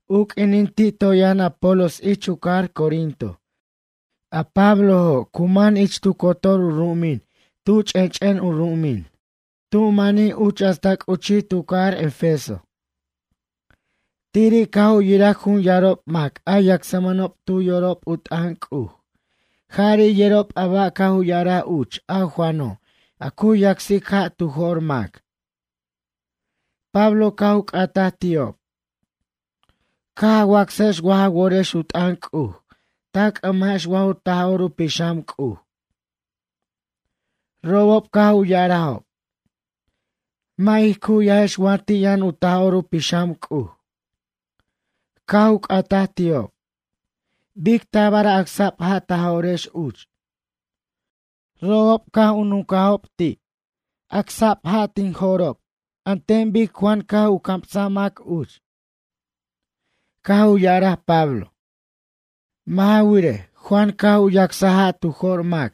U q'uinin ti' toy yʌn Apolos ich u cajar Corinto, a Pablojo' cu man ich tu cotor u ru'umin tu ch'ench'en u ru'umin, tu manij uch hasta c'uchij tu cajar Efeso. Tiri' caj u yiraj jun yarob mac a yacsmʌnob tu yorob u t'ʌn C'uj jari' yerob a ba' caj u ya'araj uch a Juano' a cu yacsic ja' tu jo'r mac. Pablo caj u c'ataj ti'ob: ―Caj a wacsajex waj a worex u t'ʌn C'uj ta c'ʌmajex wa ju Taj'or u Pixam C'uj? Robob caj u ya'arajob: ―Mʌ' ij cu'yajex wa ti' yʌn u Taj'or u Pixam C'uj. Caj u c'ataj ti'ob: ―Bic tabar acsa'b ja' ta jo'rex uch? Robob caj u nuncajob ti': ―Acsa'b ja' tij co'rex an ten bic Juan caj u camsaj mac uch. Caj u ya'araj Pablo: ―Mʌ' ja wirej, Juan caj u yacsaj ja' tu jo'r mac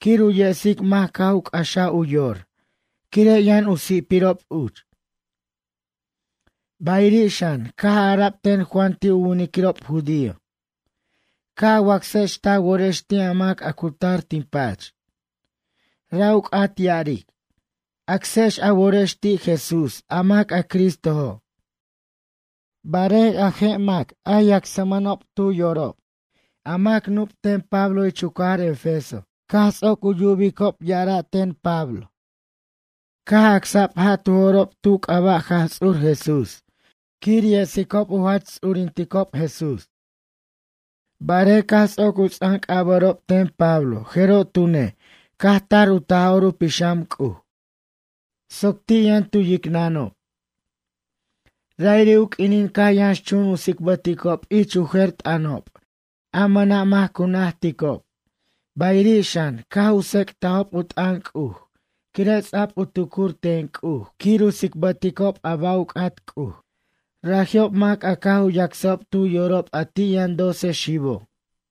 quir yesic mac caj u c'axaj u yor, quire' yʌn u si'pirob uch. Bayiri' xan, caj ara'b ten Juan ti' u winiquirob judío: “Ca' a wacsex ta worex ti' a mac a cu tar tin pach.” Ra' u c'at ya'aric: “Acsex a worex ti' Jesús, a mac a Cristojo'.” Barej, a je' mac a yacsmʌnob tu yorob a mac nup' ten Pablo ich u cajar Efeso caj ts'oc u yubicob ya'ara' ten Pablo, caj acsa'b ja' tu jo'rob tu c'aba' Jaj Ts'ur Jesús, quir yesicob u jach ts'urinticob Jesús. Barej caj ts'oc u ts'anc'abʌ'rob ten Pablo, jeroj tune' caj tar u Taj'or u Pixam C'uj soc ti' yʌn tu yicnʌnob. Ra'iri' u q'uinin caj u yʌnxchun u tsicbʌticob ich u jer u t'ʌnob a mʌna' mac cu najticob, Bayiri' xan, caj u tsec'tajob u t'ʌn C'uj quire' ts'a'b u tucur ten C'uj quir u tsicbʌticob a ba' u c'at C'uj. Raji'ob mac a caj u yacsjob tu yorob a ti' yʌn doce xibo'.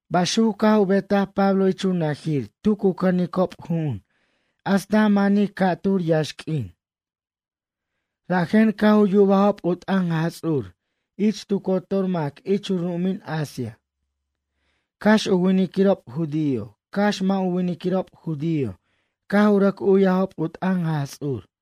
Baxuc caj u betaj Pablo ich u najir tu cu cʌnicob ju'un hasta manij ca'tur yaxq'uin. Rajen caj u yubajob u t'ʌn Jaj Ts'ur ich tu cotor mac ich u ru'umin Asia, cax u winiquirob judío, cax mʌ' u winiquirob judío caj u rʌc u'yajob u t'ʌn Jaj Ts'ur.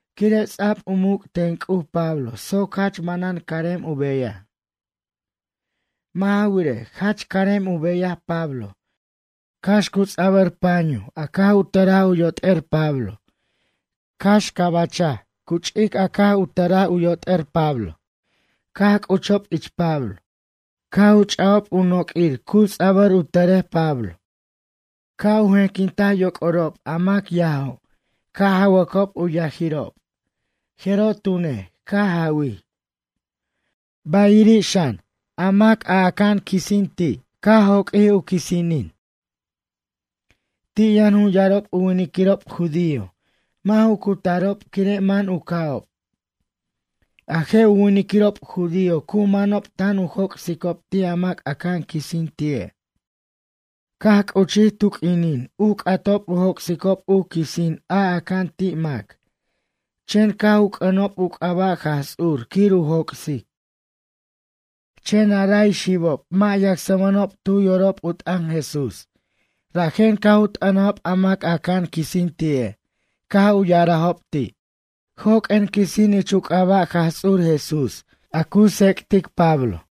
Quire' ts'a'b u muc' ten C'uj Pablo soc jach manan carem u beyaj. Mʌ' ja wirej, jach carem u beyaj Pablo, cax cu ts'abʌr panyuj a caj u tʌraj u yot'er Pablo, cax cabachaj cu ch'ic a caj u tʌraj u yot'er Pablo caj c'uchob ich Pablo. Caj u ch'ajob u noq'uir cu ts'abʌr u tʌrej Pablo, ca' u jenquintaj yoc'orob a mac yajo' ca' jawʌcob u yajirob, jeroj tune', caj jawij. Bayiri' xan, a mac aca'an quisin ti', caj joq'uij a quisinini'. Ti' yʌn jun yarob u winiquirob judío. Mʌ' ju cutarob quire' man u ca'ob. A je' u winiquirob judío cu manob tan u joc'sicob ti' a mac aca'an quisin ti'e'. Caj c'uchij tu q'uinin u c'atob u joc'sicob u quisin a aca'an ti' mac, chen caj u c'ʌnob u c'aba' Jaj Ts'ur quir u joc'sic. Chen a ray xibob, mʌ' yacsmʌnob tu yorob u t'ʌn Jesús, rajen caj u t'ʌnajob a mac a aca'an quisin ti'e', caj u ya'arajob ti': ―Joq'uen quisin ich u c'aba' Jaj Ts'ur Jesús a cu tsec'tic Pablo.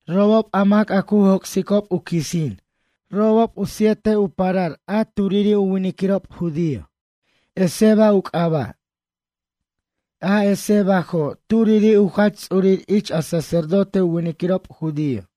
Robob a mac a cu joc'sicob u quisin, robob u siete u parar a turiri' u winiquirob judío, Esceva u c'aba'. A Escevajo', turiri' u jach ts'urir ich a sacerdote u winiquirob judío.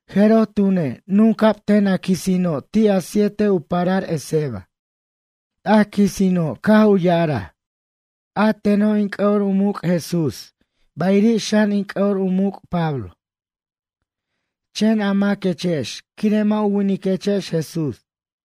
Jeroj tune', nunca'b ten a quisino' ti' a siete u parar Esceva. A quisino', caj u ya'araj: ―A teno' in c'ʌ'o u muc' Jesús, bayiri' xan, in c'ʌ'o u muc' Pablo. Chen a maquechex, quire' mʌ' u winiquechex Jesús?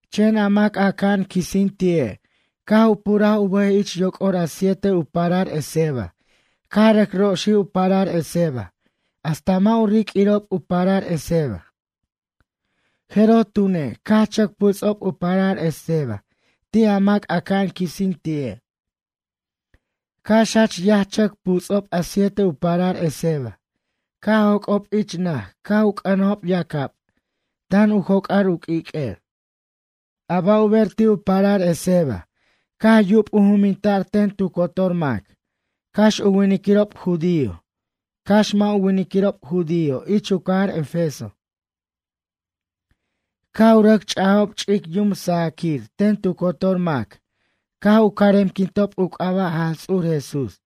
Chen a mac a aca'an quisin ti'e', caj u puraj u bʌj ich yoc'or a siete u parar Esceva, caj rʌc roxij u parar Esceva hasta mʌ' u riq'uirob u parar Esceva. Jeroj tune', caj chʌc puts'ob u parar Esceva ti' a mac a aca'an quisin ti'e', cax jach yaj chʌc puts'ob a siete u parar Esceva, caj joc'ob ich naj caj u c'ʌnajob yacab tan u joc'ar u q'uiq'uer. A ba' u ber ti' u parar Esceva caj yub u juminta'r ten tu cotor mac, cax u winiquirob judío, cax mʌ' u winiquirob judío ich u cajar Efeso. Caj u rʌc ch'ajob ch'ic yum sajaquir ten tu cotor mac, caj u caremquintob u c'aba' Jaj Ts'ur Jesús.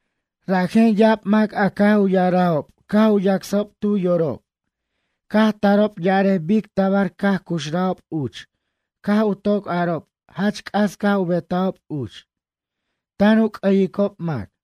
Rajen ya'ab mac a caj u ya'arajob caj u yacsajob tu yorob caj tarob ya'arej bic tabar caj cuxrajob uch caj u toc arob jach c'as caj u betajob uch, tan u c'ʌyicob mac.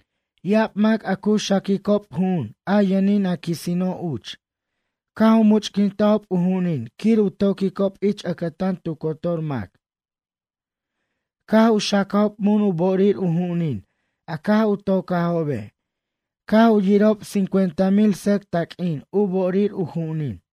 Ya'ab mac a cu xaquicob ju'un a yʌnin a quisino' uch, caj u much'quintajob u ju'unin quir u toquicob ich ʌcʌtan tu cotor mac. Caj u xacajob mun u bo'orir u ju'unin a caj u tocajobe', caj u yirajob cincuenta mil sʌc taq'uin u bo'orir u ju'unin.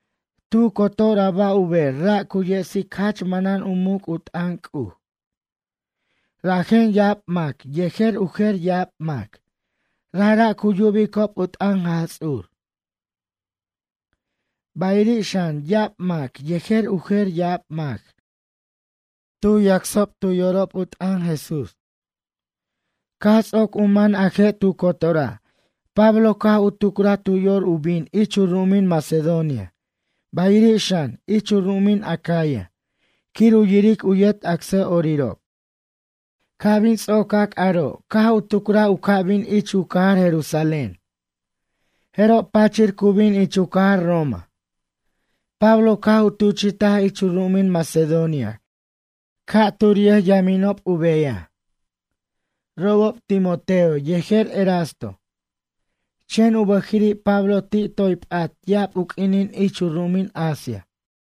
Tu cotor a ba' u ber ra' cu yesic jach manan u muc' u t'ʌn C'uj. Rajen ya'ab mac, yejer u jer ya'ab mac, rajra' cu yubicob u t'ʌn Jaj Ts'ur. Bayiri' xan, ya'ab mac, yejer u jer ya'ab mac, cu yacsob tu yorob u t'ʌn Jesús. Caj ts'oc u man a je' tu cotora', Pablo caj u tucraj tu yor u bin ich u ru'umin Macedonia, bayiri' xan, ich u ru'umin Acaya quir u yiric u yet acsa'orirob. Ca' bin ts'ocac aro', caj u tucraj u ca' bin ich u cajar Jerusalén. Jeroj pachir cu bin ich u cajar Roma. Pablo caj u tuchi'taj ich u ru'umin Macedonia ca' tur yʌjyaminob u beyaj. Robob Timoteo yejer Erasto. Chen u bʌjiri' Pablo ti' toy p'at ya'ab u q'uinin ich u ru'umin Asia.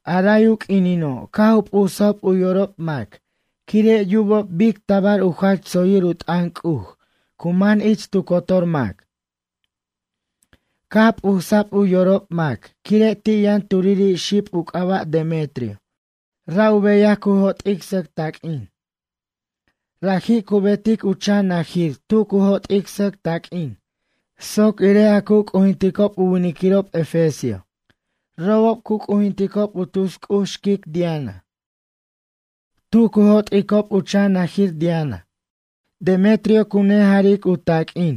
A ray u q'uinino', caj u p'usajob u yorob mac quire' yubob bic tabar u jach tsoyir u t'ʌn C'uj cu man ich tu cotor mac. Caj p'usa'b u yorob mac, quire' ti' yʌn turiri' xib u c'aba' Demetrio, ra' u beyaj cu jo't'ic sʌc taq'uin. Raji' cu betic u chan najir tu cu jo't'ic sʌc taq'uin soc irej a cu c'ujinticob u winiquirob efesio. Robob cu c'ujinticob u tus c'uj xquic Diana. Tu cu jo't'icob u chan najir Diana Demetrio cu nejaric u taq'uin,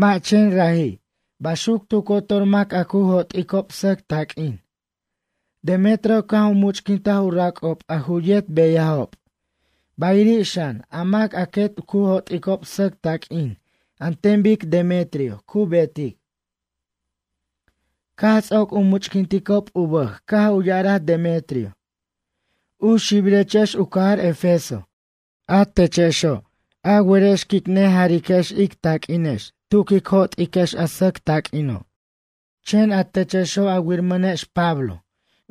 mʌ' chen raji' baxuc tu cotor mac a cu jo't'icob sʌc taq'uin. Demetrio caj u much'quintaj u rac'ob a ju yet beyajob, bayiri' xan, a mac a quet cu jo't'icob sʌc taq'uin an ten bic Demetrio cu betic. Caj ts'oc u much'quinticob u bʌj caj u ya'araj Demetrio: ―U xibirechex u cajar Efeso, a techexo', a werex quic nejariquex ic taq'uinex tu quic jo't'iquex a sʌc taq'uino'. Chen a techexo', a wiramʌnex Pablo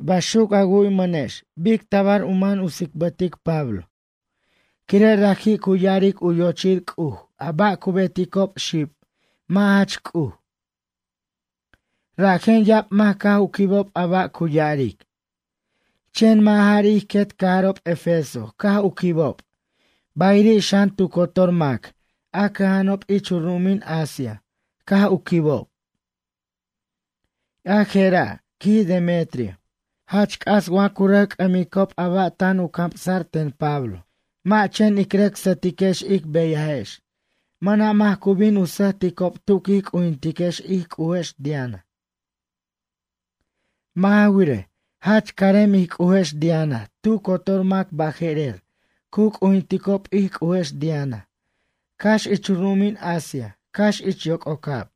baxuc a wu'ymʌnex bic tabar u man u tsicbʌtic Pablo, quire' raji' cu ya'aric u yochir c'uj a ba' cu beticob xib mʌ' jach C'uj. Rajen ya'ab mac caj u quibob a ba' cu ya'aric. Chen mʌ' jari' ij quet cajarob Efeso caj u quibicob, bayiri' xan, tu cotor mac a cʌja'anob ich u ru'umin Asia caj u quibob. A jera' ―quij Demetrio―, jach c'as wa cu rʌc c'ʌmicob a ba' tan u camsa'r ten Pablo, mʌ' chen ic rʌc sʌtiquex ic beyajex, mʌna' mac cu bin u sʌjticob tu quij c'ujintiquex ij c'ujex Diana. Mʌ' ja wirej, jach carem ij c'ujex Diana, tu cotor mac baje'rer cu c'ujinticob ij c'ujex Diana cax ich u ru'umin Asia cax ich yoc'ocab.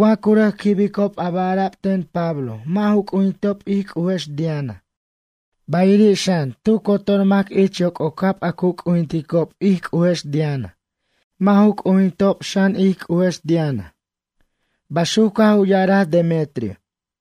Wa cu rʌc quibicob a ba' ara'b ten Pablo mʌ' ju c'ujintob ij c'ujex Diana, bayiri' xan tu cotor mac ich yoc'ocab a cu c'ujinticob ij c'ujex Diana, mʌ' ju c'ujintob xan, ij c'ujex Diana ―baxuc caj u ya'araj Demetrio.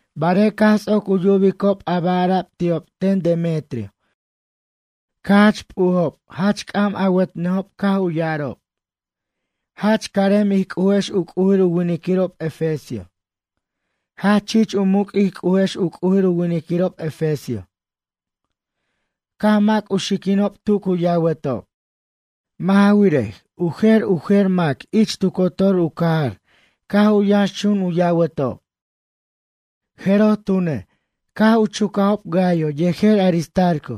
Barej caj ts'oc u yubicob a ba' ara'b ti'ob ten Demetrio caj jach p'ujob, jach c'am awʌtnʌjob caj u ya'arob: ―Jach carem ij c'ujex u c'ujir u winiquirob efesio. Jach chich u muc' ij c'ujex u c'ujir u winiquirob efesio. Caj mac u xiquinob tu cu yawatob. Mʌ' ja wirej, u jer u jer mac ich tu cotor u cajar caj u yʌnxchun u yawatob. Jeroj tune', caj chucajob Gayo yejer Aristarco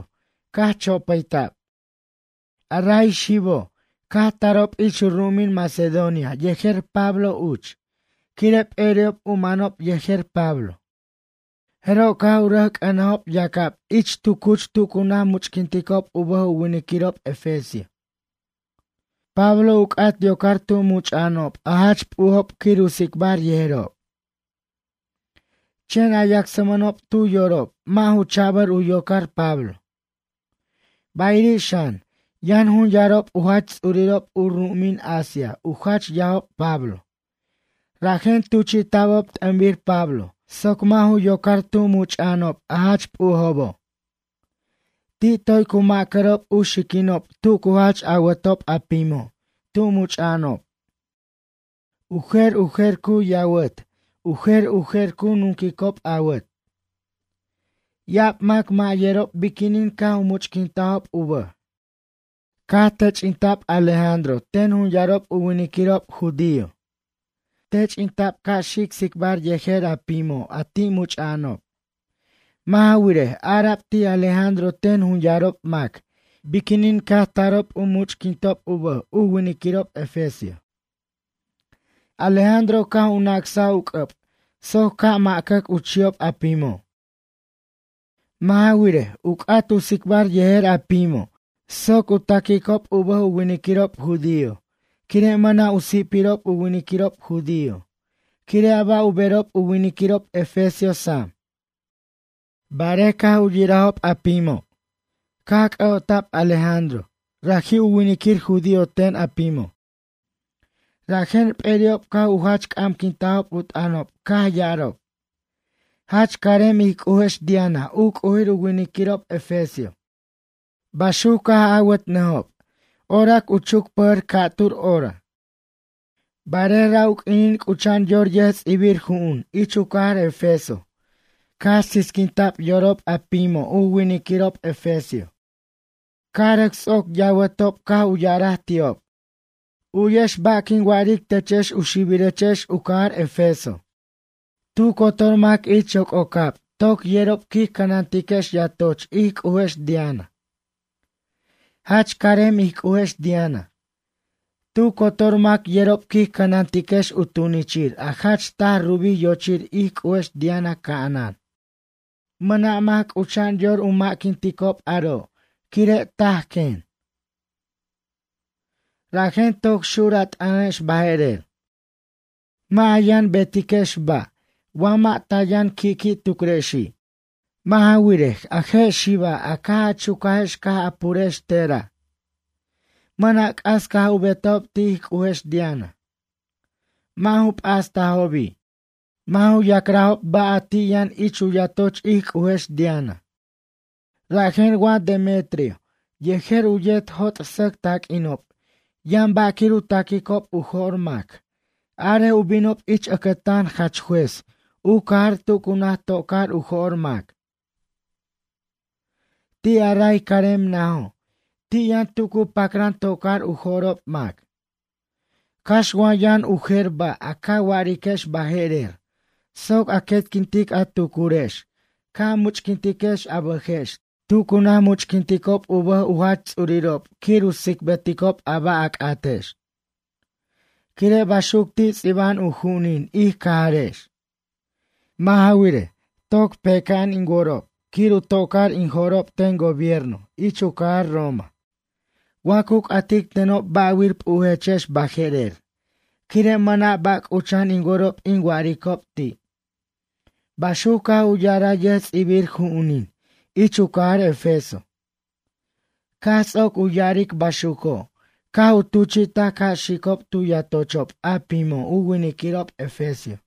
caj chopʌyta'b. A ray xibo', caj tarob ich u ru'umin Macedonia yejer Pablo uch, quire' p'eri'ob u manob yejer Pablo. Jeroj caj u rʌc c'ʌnajob yacab ich tu cuch tu cu naj much'quinticob u bʌj u winiquirob efesio. Pablo u c'at yocar tu much'a'anob a jach p'ujob quir u tsicbar yejerob. Chen a yacsmʌnob tu yorob, mʌ' ju cha'bʌr u yocar Pablo. Bayiri' xan, yʌn jun yarob u jach ts'urirob u ru'umin Asia u jach yajob Pablo, rajen tuchi'ta'bob t'ʌnbir Pablo soc mʌ' ju yocar tu much'a'anob a jach p'ujobo'. Ti' toy cu macʌrob u xiquinob tu cu jach awʌtob a pimo' tu much'a'anob. U jer u jer cu yawʌt, u jer u jer cu nunquicob awat. Ya'ab mac mʌ' yerob biquinin caj u much'quintajob u bʌj. Caj tench'inta'b Alejandro ten jun yarob u winiquirob judío. Tench'inta'b ca' xic tsicbar yejer a pimo', a ti' much'a'anob. Mʌ' ja wirej, ara'b ti' Alejandro ten jun yarob mac biquinin caj tarob u much'quintob u bʌj u winiquirob efesio. Alejandro caj u nacsaj u c'ʌb soc ca' macʌc u chi'ob a pimo'. Mʌ' ja wirej, u c'at u tsicbar yejer pimo' soc taquicob u bʌj u winiquirob judío, quire' mʌna' u si'pirob u winiquirob judío, quire' a ba' u berob u winiquirob efesio sam. Barej caj u yirajob a pimo' Alejandro caj c'ʌ'ota'b Alejandro raji' u winiquir judío ten a pimo'. Rajen p'eri'ob caj u jach c'amquintajob u t'ʌnob caj ya'arob: ―Jach carem ij c'ujex Diana u c'ujir u winiquirob efesio ―baxuc caj awʌtnʌjob orac u chucpʌjʌr ca'tur hora. Barej ra' u q'uinin c'ucha'an yor yʌjts'ibir ju'un ich u cajar Efeso caj sisquinta'b yorob a pimo' u winiquirob efesio, caj rʌc ts'oc yawʌtob caj u ya'araj ti'ob: ―U'yex ba' quin wa'aric techex u xibirechex u cajar Efeso. Tu cotor mac ich yoc'ocab toc yerob quij cʌnantiquex yatoch ij c'ujex Diana. Jach carem ij c'ujex Diana. Tu cotor mac yerob quij cʌnantiquex u tunichir a jach taj rubij yochir ij c'ujex Diana ca'anan. Mʌna' mac c'ucha'an yor u ma'quinticob aro' quire' taj quen. Rajen toc xur a t'ʌnex baje'rer. Mʌ' a yʌn betiquex ba', wa mʌ' ta yʌn qui'qui' tucrexi'. Mʌ' ja wirej, a je' xiba', a caj a chucajex caj a purex tera'. Mʌna' c'as caj u betajob ti' ij c'ujex Diana. Mʌ' ju p'astajobi'. Mʌ' ju ya'crajob ba' a ti' yʌn ich u yatoch ij c'ujex Diana. Rajen wa Demetrio yejer u yet jo't' sʌc taq'uinob yʌn ba' quir u taquicob u jo'r mac, arej u binob ich ʌcʌtan jach juez u cajar tu cu naj tocar u jo'r mac. Ti' a ray carmen najo', ti' yʌn tu cu pacran tocar u jo'rob mac. Cax wa yʌn u jer ba' a ca wa'ariquex baje'rer, soc a quetquintic a tucurex ca' a muchq'uintiquex a bʌjex tu cu naj muchquinticob u bʌj u jach ts'urirob quir u tsicbʌticob a ba' a c'atex. Quire' baxuc ti' ts'iba'an u ju'unin ic cajarex. Mʌ' ja wirej, toc peca'an in worob quir u tocar in jo'rob ten gobierno ich u cajar Roma wa cu c'atic tenob ba'wir p'ujechex baje'rer, quire' mʌna' ba' c'ucha'an in worob in wa'aricob ti' ―baxuc caj u ya'araj yʌjts'ibir ju'unin ich u cajar Efeso. Caj ts'oc u ya'aric baxuco', caj u tuchi'taj ca' xicob tu yatochob a pimo' u winiquirob efesio.